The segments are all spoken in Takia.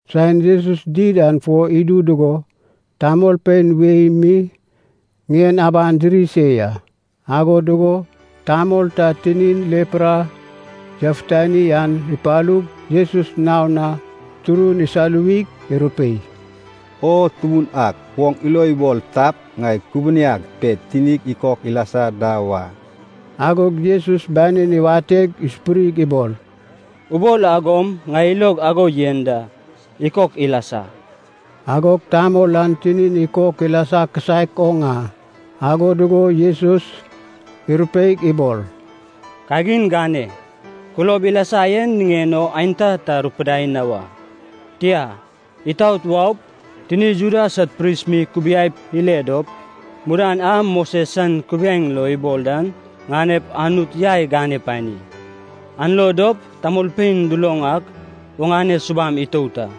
Saen Jesus did an fo idu dugo tamolpein wei mi ŋien aban diri se ya. Ago dugo tamol ta tinin lepra yafutani an ipalug Jesus naon na turun isaluwig irupei, “O Tubun ak, oŋ ilo ibol tap, ŋai kubuniag pe tinig ikok ilasa da wa.” Agog Jesus banin iwateg isupurig ibol, “Ubol agom ŋai ilog ago yen da, ikok lasa.” Agog tamol an tinin ikok ilasa kisaek oŋ a. Ago dugo Jesus irupeig ibol, “Kagin gane, kulob ilasa yen niŋen o aenta ta rupidai na wa. Tia, itaot waup, tini Juda sad pris mi kubiaip ile dop, mudan a Moses san kubiaeŋ lo ibol dan ŋanep Anut yai gane pani. An lo dop tamolpein duloŋ ak oŋane subam itout a.”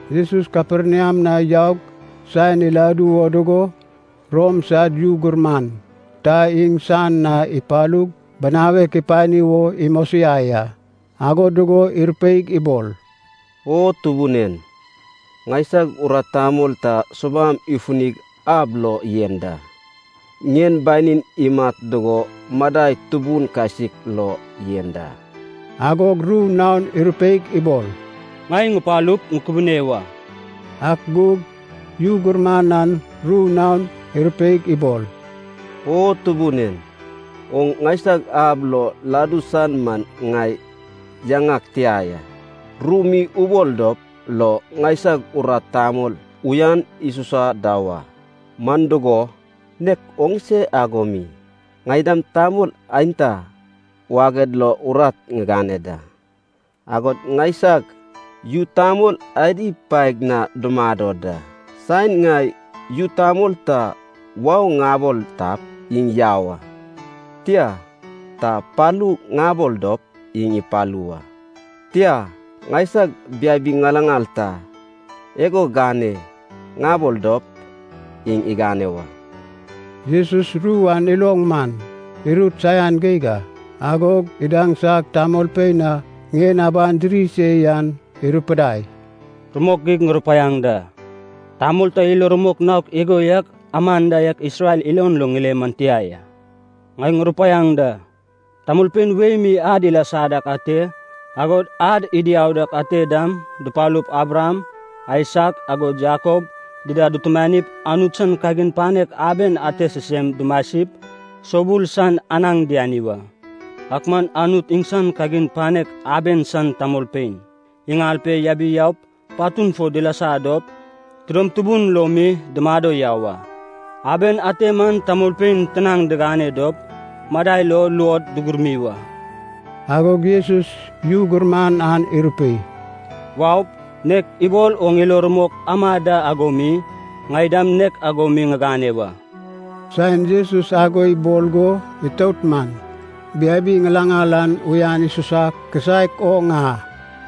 Jesus Kaperniam na yaug saen iladu wo dugo Rom san yu gurman ta iŋsan na ipalug binawek ipani wo imosiai a. Ago dugo irupeig ibol, “O Tubun en, ŋaisag urat tamol ta subam ifunig ab lo yen da. Ŋien banin imat dugo madai tubun kasik lo yen da.” Agog ru naon irupeig ibol, “Ŋai ŋupalup ŋukubune wa.” Ak gug yu gurman an ru naon irupeig ibol, “O Tubun en, oŋ ŋaisag ab lo ladu san man ŋai yaŋag tia ya. Ru mi ubol dop lo ŋaisag urat tamol uyan isusa da wa. Man dugo, nek oŋse ago mi, ŋai dam tamol aenta waged lo urat ŋigane da, agod ŋaisag yu tamol adi paeg na dumado da. Saen ŋai yu tamol ta ‘wau’ ŋabol tap, iŋ yau a. Tia, ta ‘palu’ ŋabol dop iŋ ipalu wa. Tia, ŋaisag biabi ŋilaŋal ta ‘igo gane’ ŋabol dop, iŋ igane wa.” Jesus ru an iloŋ man, irut saian geig a. Agog idaŋsag tamolpein a ŋien aban diri se yan irupidai, “Rumok geig ŋurupaiaŋ da, tamol ta ilo rumok naok igo yak aman da Isrel ilon lo ŋile man tia ya. Ŋai ŋurupaiaŋ da, tamolpein wei mi ad ilasa dak ate, agod ad idiau dak ate dam dupalup Abraham, Aisak, agod Jakob dida dutumanip, Anut san kagin panek aben ante sisem dumasip, soubul san anaŋ diani wa. Ak man Anut iŋsan kagin panek aben san tamolpein iŋal pe yabiaup patun fo dilasa dop tidom tubun lo mi dumado yau a. Aben ante man tamolpein tinaŋ digane dop madai lo luod dugurmi wa.” Agog Jesus yu gurman an irupei, “Waup, nek ibol oŋ ilo rumok ama da ago mi, ŋai dam nek ago mi ŋigane wa.” Saen Jesus ago ibol go itout man, biabi ŋilaŋal an uyan isusa kisaek oŋ a.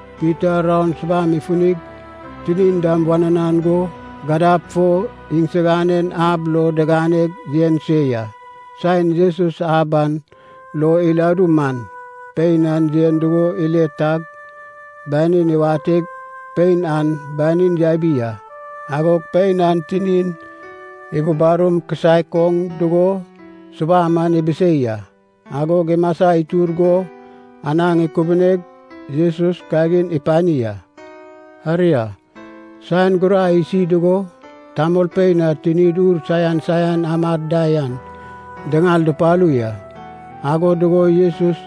Pita raon subam ifunig tinin dam wananan go, gadab fo iŋsiganen ab lo diganeg yen se ya. Saen Jesus ab an lo iladu man, pein an yen dugo ile tag banin iwateg pein an banin yabi a. Agog pein an tinin ibubarum kisaek oŋ dugo subam an ibisei a. Agog imasa itur go anaŋ ikubuneg Jesus kagin ipani a. Aria, saen gurai isi dugo, tamolpein a tinid ur saian saian amad da yan diŋal dupalu ya. Ago dugo Jesus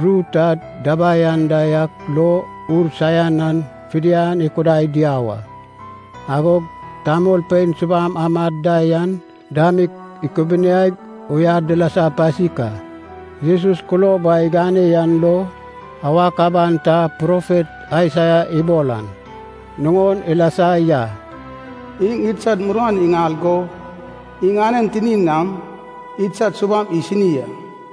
ru ta dabai anda yak lo ur saian an fidian ikudai diau a, agog tamolpein subam amad da yan dam ikubuniaig uyan dilasa pasik a. Jesus kulob a igane yan lo awak aban ta profet Aisaia ibol an nuŋon ilasa ya, “Iŋ idsad muruan iŋal go iŋanen tinin nam idsad subam isini a.”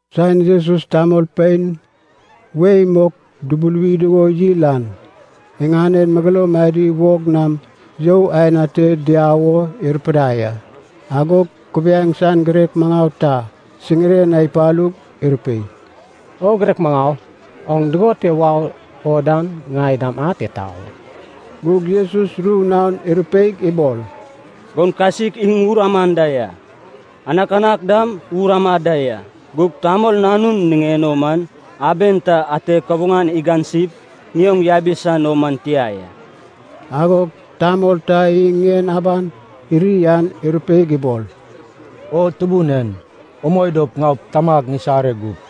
Saen Jesus tamolpein wei mok dubuluwi dugo yil an, iŋanen megeloum adi wog nam you aen ate diau wo irupidai a. Agog kubiaeŋ san girek maŋau ta siŋiren na ipalug irupei, “O Girek Maŋau, oŋ dugon te wau o dan, ŋai dam ate tau a.” Gug Jesus ru naon irupeig ibol, “Goun kasik iŋ wur amad da ya, anakanak dam wur amad da ya, gug Tamol Nanun niŋen o man aben ta ate kabuŋan igansip ŋioŋ yabi san o man tia ya.” Agog tamol ta iŋ ŋien aban iri an irupeig ibol, “O Tubun en, umoi dop ŋaup, tamag ŋisare gup.”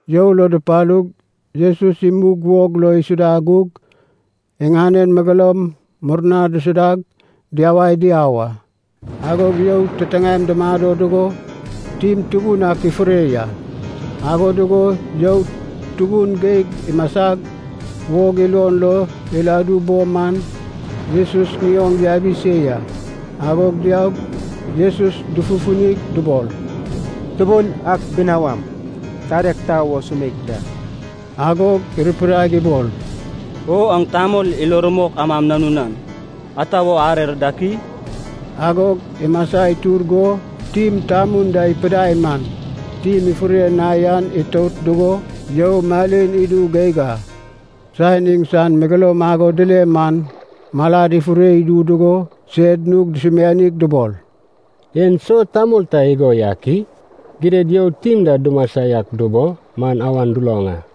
You lo dupalug Jesus imug wog lo isuda gug iŋanen megeloum murna disudag diyawai diau a. Agog you titiŋaem dumado dugo tim tubun ak ifure ya. Ago dugo you tubun geig imasag wog ilon lo iladu bo man Jesus ŋioŋ yabi se ya. Agog diaug Jesus dufufunig dubol, “Tubun ak binawam, tadeg tau o sumeik da.” Agog irupidaig ibol, “O aŋ tamol ilo rumok amam nanunan, ata wo arer dak i?” Agog imasa itur go tim tamun da ipidai man, tim ifure na yan itout dugo you malin idu geig a. Saen iŋsan megeloum ago dile man malad ifure idu dugo sed nug dusumianig dubol, “En so tamol ta igo yak i? Gidad you tim da dumasa yak dubo man awan duloŋ a.”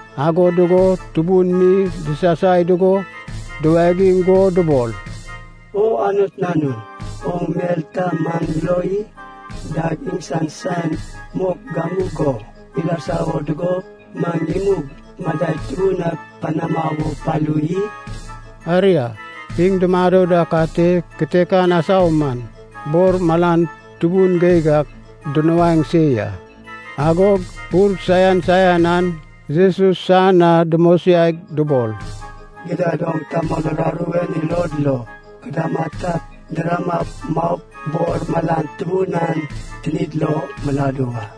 Ago dugo tubun mi disasai dugo duwagiŋ go dubol, “O Anut Nanun, oŋ mel ta maŋ lo i? Dag iŋsan saen mok gamugo ilasa wo dugo, maŋ imug madai tubun ak panama wo palu i?” Aria, iŋ dumado dak ate kitekan asau man, bor malan tubun geig ak dunuaeŋ se ya. Agog ur saian saian an Jesus san na dumosiaig dubol, “Gidad oŋ tamol uraru en ilod lo kudama tap, diramap maup bor malan tubun an tinid lo miladu wa.”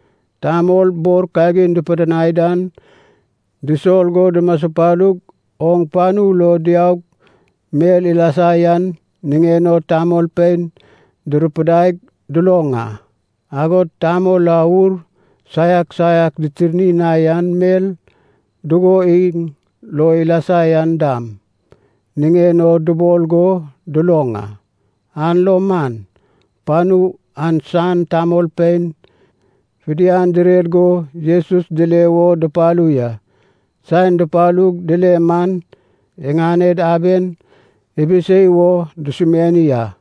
Tamol bor kagin dupidinai dan disol go dumaspalu oŋ panu lo diaug mel ilasa yan niŋen o tamolpein durupidaig duloŋ a. Agod tamol a ur saiak saiak ditirni na yan mel dugo iŋ lo ilasa yan dam niŋen o dubol go duloŋ a. An lo man, panu an san tamolpein fidian direr go Jesus dile wo dupalu ya. Saen dupalug dile man iŋaned aben ibisei wo dusumiani a.